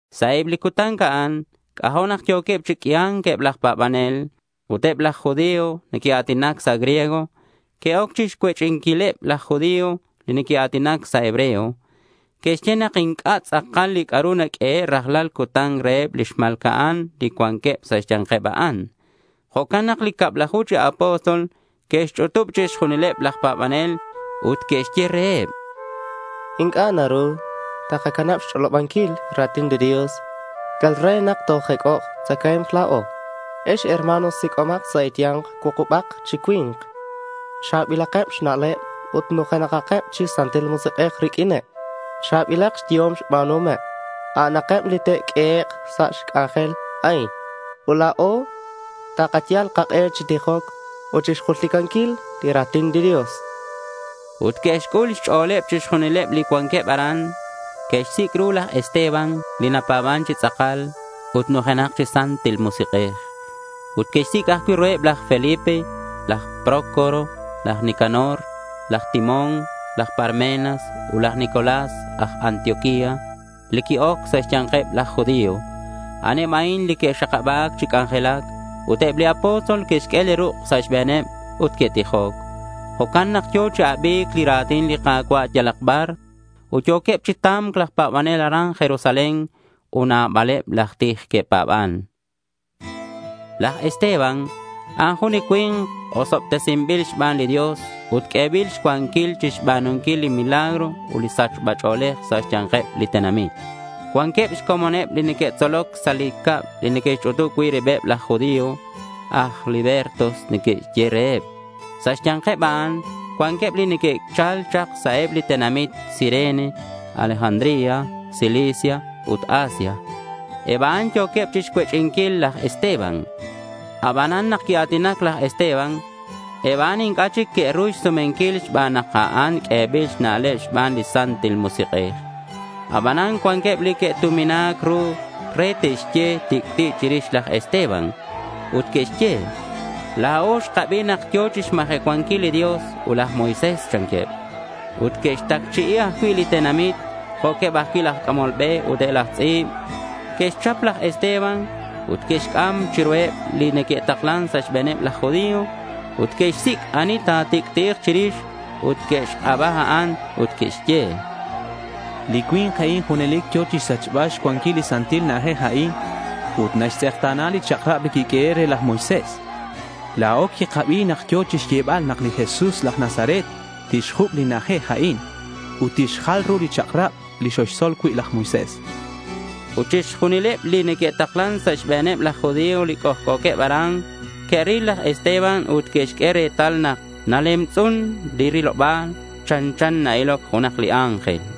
Sa' eb li cutan a'an c'ajo' nak yo̱queb chi q'uia̱nc eb laj pa̱banel. Ut eb laj judío li neque'a̱tinac sa' griego que'oc chixcuech'inquileb laj judío li neque'a̱tinac sa' hebreo. Que'xye nak inc'a' tz'akal li c'a'ru naq'uehe' rajlal cutan reheb lix ma̱lca'an li cuanqueb sa' xya̱nkeb a'an. Jo'can nak li cablaju chi apóstol que'xch'utub chixjunileb laj pa̱banel ut que'xye reheb: —Inc'a' naru takacanab xch'olobanquil ra̱tin li Dios yal re nak tojec'ok tzacae̱mk la̱o. Ex herma̱n, sic'omak sa' e̱ya̱nk cuukubak chi cui̱nk cha̱bilakeb xna'leb ut nujenakeb chi Santil Musik'ej riq'uineb. Cha̱bilak xyehom xba̱nuhomeb. A'aneb li te'q'uehek' sa' li c'anjel a'in. Ut la̱o takayal kak'e chi tijoc ut chixjulticanquil li ra̱tin li Dios, chanqueb. Ut que'xc'ul xch'o̱leb chixjunil li cuanqueb aran. Que'xsic' ru laj Esteban li napa̱ban chi tz'akal ut nujenak chi Santil Musik'ej. Ut que'xsic' ajcui' ruheb laj Felipe, laj Prócoro, laj Nicanor, laj Timón, laj Parmenas, ut laj Nicolás aj Antioquía li qui-oc sa' xya̱nkeb laj judío. A'aneb a'in li que'xakaba̱c chi c'anjelac. Ut eb li apóstol que'xq'ue li ruk' sa' xbe̱neb ut que'tijoc. Jo'can nak yo̱ chi abi̱c li ra̱tin li Ka̱cua' yalak bar. Ut yo̱queb chi ta̱mc laj pa̱banel aran Jerusalén. Ut nabaleb laj tij que'pa̱ban. Laj Esteban a'an jun cui̱nk osobtesinbil xban li Dios ut q'uebil xcuanquil chixba̱nunquil li milagro ut sachba ch'o̱lej sa' xya̱nkeb li tenamit. Cuanqueb xcomoneb li neque'tzoloc sa' li cab li neque'xch'utub cui' ribeb laj judío. Aj libertos neque'xye reheb. Sa' xya̱nkeb a'an cuanqueb li neque'chal chak sa' eb li tenamit Cirene, Alejandría, Cilicia ut Asia. Eb a'an yo̱queb chixcuech'inquil laj Esteban. Abanan nak quia̱tinac laj Esteban, eb a'an inc'a' chic que'ru xsumenquil xban nak a'an q'uebil xna'leb xban li Santil Musik'ej. Aban cuanqueb li que'tumina̱c ru re te'xye tic'ti' chirix laj Esteban. Ut que'xye: —La̱o xkabi nak yo̱ chixmajecuanquil li Dios ut laj Moisés, chanqueb. Ut que'xtacchi'i ajcui' li tenamit, jo'queb ajcui' laj c'amol be ut eb laj tz'i̱b. Que'xchap laj Esteban ut que'xc'am chiruheb li neque'taklan sa' xbe̱neb laj judío. Ut que'xsic' ani ta̱tic'ti'ik chirix ut que'xk'aba a'an ut que'xye: —Li cui̱nk a'in junelic yo̱ chixsachbal xcuanquil li santil na'ajej a'in ut naxtz'ekta̱na li chak'rab li quiq'uehe' re laj Moisés. La̱o quikabi nak yo̱ chixyebal nak li Jesús laj Nazaret tixjuc' li na'ajej a'in, ut tixjal ru li chak'rab li coxtzol cui' laj Moisés, chanqueb. Ut chixjunileb li neque'taklan sa' xbe̱neb laj judío li c'ojc'o̱queb aran que'ril laj Esteban ut que'xq'ue retal nak nalemtz'un li riloba̱l. Chanchan na-iloc jun li ángel.